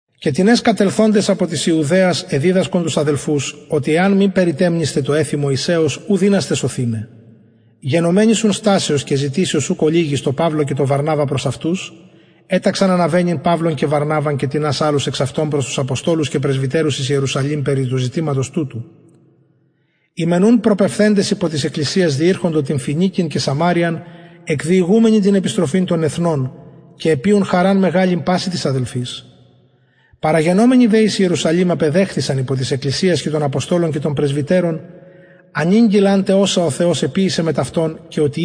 και τινες κατελθοντες απο της ιουδαιας εδιδασκον τους αδελφους οτι εαν μη περιτεμνησθε τω εθει μωυσεως ου δυνασθε σωθηναι γενομενης ουν στασεως και ζητησεως ουκ ολιγης τω παυλω και τω βαρναβα προς αυτους εταξαν αναβαινειν παυλον και βαρναβαν και τινας αλλους εξ αυτων προς τους αποστολους και πρεσβυτερους εις ιερουσαλημ περι του ζητηματος τουτου οι μεν ουν προπεμφθεντες υπο της εκκλησιας διηρχοντο την φοινικην και σαμαρειαν εκδιηγουμενοι την επιστροφην των εθνων και εποιουν χαραν μεγαλην πασιν τοις αδελφοις παραγενομενοι δε εις ιερουσαλημ απεδεχθησαν υπο της εκκλησιας και των αποστολων και των πρεσβυτερων ανηγγειλαν τε οσα ο θεος εποιησεν μετ αυτων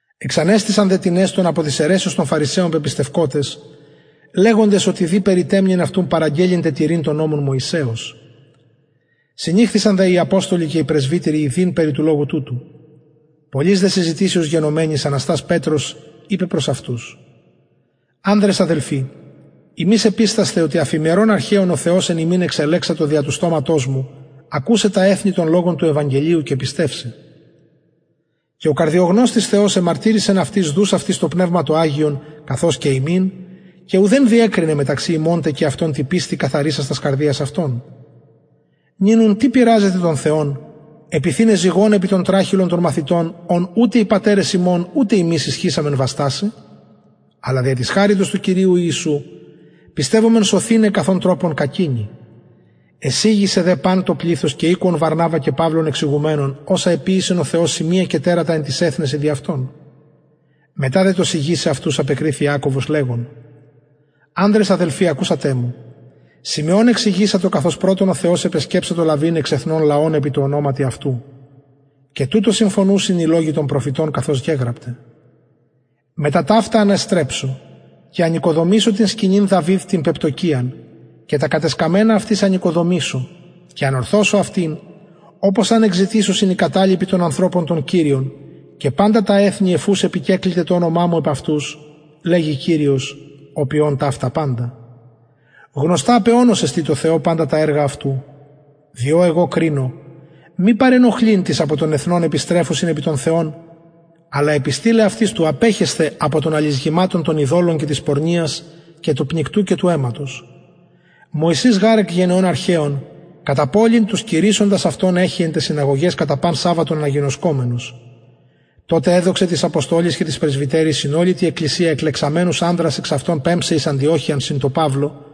εξανεστησαν δε τινες των απο της αιρεσεως των φαρισαιων πεπιστευκοτες λεγοντες οτι δει περιτεμνειν αυτους παραγγελλειν τε τηρειν τον νομον μωυσεως συνηχθησαν δε οι αποστολοι και οι πρεσβυτεροι ιδειν περι του λογου τουτου πολλης δε συζητησεως γενομενης αναστας πετρος ειπεν προς αυτους ανδρες αδελφοι υμεις επιστασθε οτι αφ ημερων αρχαιων ο θεος εν ημιν εξελεξατο δια του στοματος μου ακουσαι τα εθνη τον λογον του ευαγγελιου και πιστευσαι και ο καρδιογνωστης θεος εμαρτυρησεν αυτοις δους αυτοις το πνευμα το αγιον καθως και ημιν και ουδεν διεκρινεν μεταξυ ημων τε και αυτων τη πιστει καθαρισας τας καρδιας αυτων νυν ουν τι πειραζετε τον θεον επιθειναι ζυγον επι τον τραχηλον των μαθητων ον ουτε οι πατερες ημων ουτε ημεις ισχυσαμεν βαστασαι αλλα δια της χαριτος του κυριου ιησου πιστευομεν σωθηναι καθ ον τροπον κακεινοι εσιγησεν δε παν το πληθος και ηκουον βαρναβα και παυλου εξηγουμενων οσα εποιησεν ο θεος σημεια και τερατα εν τοις εθνεσιν δι αυτων μετα δε το σιγησαι αυτους απεκριθη ιακωβος λεγων ανδρες αδελφοι ακουσατε μου συμεων εξηγησατο καθως πρωτον ο θεος επεσκεψατο λαβειν εξ εθνων λαον επι τω ονοματι αυτου και τουτω συμφωνουσιν οι λογοι των προφητων καθως γεγραπται μετα ταυτα αναστρεψω και ανοικοδομησω την σκηνην δαυιδ την πεπτωκυιαν και τα κατεσκαμμενα αυτης ανοικοδομησω και ανορθωσω αυτην οπως αν εκζητησωσιν οι καταλοιποι των ανθρωπων τον κυριον και παντα τα εθνη εφ ους επικεκληται το ονομα μου επ αυτους λεγει κυριος ο ποιων ταυτα παντα γνωστα απ αιωνος εστιν τω θεω παντα τα εργα αυτου διο εγω κρινω μη παρενοχλειν τοις απο των εθνων επιστρεφουσιν επι τον θεον αλλα επιστειλαι αυτοις του απεχεσθαι απο των αλισγηματων των ειδωλων και της πορνειας και του πνικτου και του αιματος μωυσης γαρ εκ γενεων αρχαιων κατα πολιν τους κηρυσσοντας αυτον εχει εν ταις συναγωγαις κατα παν σαββατον αναγινωσκομενος τοτε εδοξεν τοις αποστολοις και τοις πρεσβυτεροις συν ολη τη εκκλησια εκλεξαμενους ανδρας εξ αυτων πεμψαι εις αντιοχειαν συν παυλω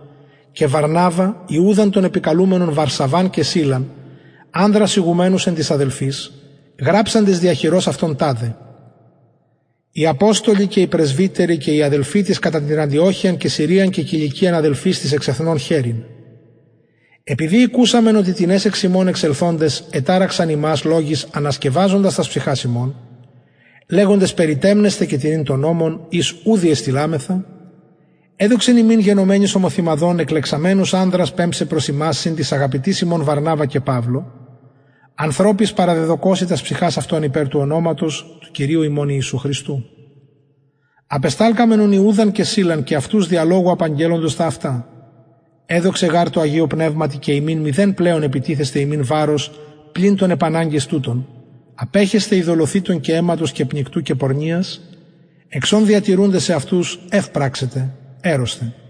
και βαρναβα ιουδαν τον επικαλουμενον βαρσαββαν και σιλαν ανδρας ηγουμενους εν τοις αδελφοις γραψαντες δια χειρος αυτων ταδε οι αποστολοι και οι πρεσβυτεροι και οι αδελφοι τοις κατα την αντιοχειαν και συριαν και κιλικιαν αδελφοις τοις εξ εθνων χαιρειν επειδη ηκουσαμεν οτι τινες εξ ημων εξελθοντες εταραξαν υμας λογοις ανασκευαζοντες τας ψυχας υμων λεγοντες περιτεμνεσθαι και τηρειν τον νομον οις ου διεστειλαμεθα εδοξεν ημιν γενομενοις ομοθυμαδον εκλεξαμενους ανδρας πεμψαι προς υμας συν τοις αγαπητοις ημων βαρναβα και παυλω ανθρωποις παραδεδωκοσιν τας ψυχας αυτων υπερ του ονοματος του κυριου ημων ιησου χριστου απεσταλκαμεν ουν ιουδαν και σιλαν και αυτους δια λογου απαγγελλοντας τα αυτα εδοξεν γαρ τω αγιω πνευματι και ημιν μηδεν πλεον επιτιθεσθαι υμιν βαρος πλην των επαναγκες τουτων απεχεσθαι ειδωλοθυτων και αιματος και πνικτου και πορνειας εξ ων διατηρουντες εαυτους ευ πραξετε ερρωσθε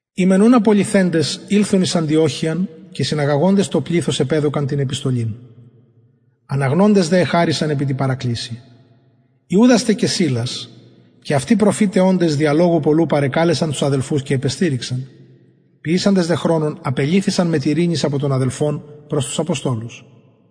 οι μεν ουν απολυθεντες ηλθον εις αντιοχειαν και συναγαγοντες το πληθος επεδωκαν την επιστολην αναγνοντες δε εχαρησαν επι τη παρακλησει ιουδας τε και σιλας και αυτοι προφηται οντες δια λογου πολλου παρεκαλεσαν τους αδελφους και επεστηριξαν ποιησαντες δε χρονον απελυθησαν μετ ειρηνης απο των αδελφων προς τους αποστολους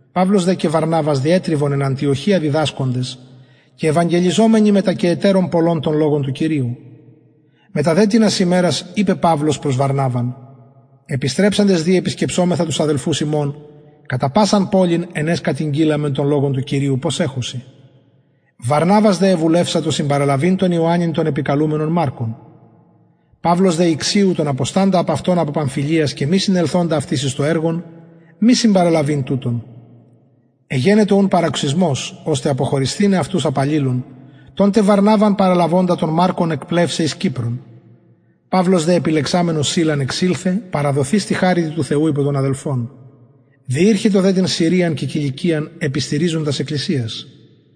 παυλος δε και βαρναβας διετριβον εν αντιοχεια διδασκοντες και ευαγγελιζομενοι μετα και ετερων πολλων τον λογον του κυριου μετα δε τινας ημερας ειπεν παυλος προς βαρναβαν επιστρεψαντες δη επισκεψωμεθα τους αδελφους ημων κατα πασαν πολιν εν αις κατηγγειλαμεν τον λογον του κυριου πως εχουσιν βαρναβας δε εβουλευσατο συμπαραλαβειν τον ιωαννην τον καλουμενον μαρκον παυλος δε ηξιου τον αποσταντα απ αυτων απο παμφυλιας και μη συνελθοντα αυτοις εις το εργον μη συμπαραλαβειν τουτον εγενετο ουν παροξυσμος ωστε αποχωρισθηναι αυτους απ αλληλων τον τε βαρναβαν παραλαβοντα τον μαρκον εκπλευσαι εις κυπρον παυλος δε επιλεξαμενος σιλαν εξηλθεν παραδοθεις τη χαριτι του θεου υπο των αδελφων διηρχετο δε την συριαν και κιλικιαν επιστηριζων τας εκκλησιας